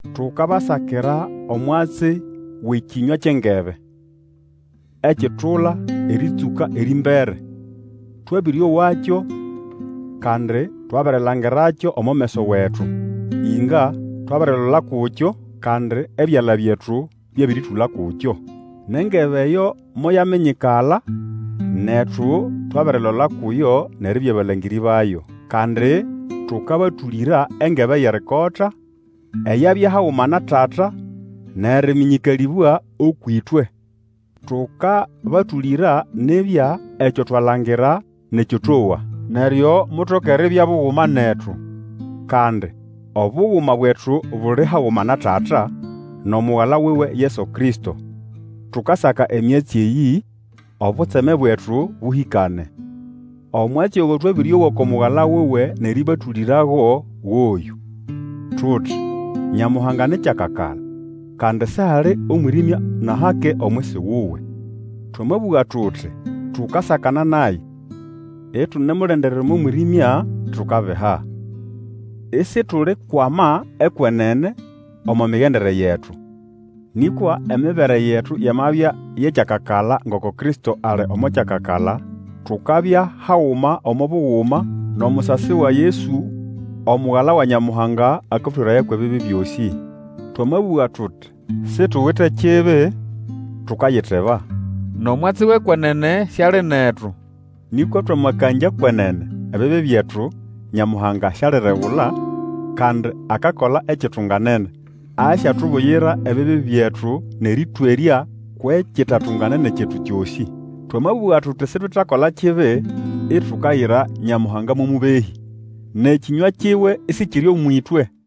Tukabasakira omwatsi wʼEkĩnywa kyʼengebe, ekitula erĩtsũka erĩmbere. Twabĩrĩowakyo, kandi twabirilangirakyo omo meso wetu. Inga, twabirilola kukyo, kandi ebyala byetu byabĩrĩtũla kukyo. Nʼengebe eyo moyaminyikala, netu twabirilola kuyo nʼeribya balangĩrĩ bayo, kandi tũkabatũlĩra engebe yʼerikota, eyabya haguma na Tata nʼerĩmĩnyĩkalĩbwa ũkwʼĩtwe. Tũkabatũlĩra nibya ekyo twalangira nʼekyo towa, neryo mutoke eribya buguma netu; kandi Obuguma bwetu buli haguma na Tata, nʼomugala wuwe Yesu Kristo. Tukasaka emyatsi eyĩ, obutseme bwetu bũhĩkane. Omwatsi ogo twabĩrĩowa uku Mugala wuwe nʼerĩbatũlĩrago goyũ: tuti, Nyamuhanga ni kyakakala, kandi sihali omwĩrĩmya nʼahake omwisi wuwe. Twamabũga tuti tukasakana naye, itunemulendera omo mwĩrĩmya, tukabiha, isitulikwama ekwenene omo migendere yetu. Nĩkwa emibere yetu yamabya yʼekyakakala ngoko Kristo ali omo kyakakala, tukabya haguma omo buguma, nʼomusasi wa Yesu Omugala wa Nyamuhanga akatweraya kwʼebibi byosĩ. Twamabũga tuti situwite kibi, tukayiteba, nʼomwatsi wʼekwenene siali netu. Nĩkwa twamakangya kwenene, ebibi byetu, Nyamuhanga sialiregula, kandi akakola ekitunganene. Asyatubuyira ebibi byetu nʼerĩtwerya kwʼekitatunganene kyetu kyosĩ. Twamabũga tuti sitwetakola kibi, itukayira Nyamuhanga mo mũbehĩ, nʼekĩnywa kiwe isikiri ũmwʼĩtwe.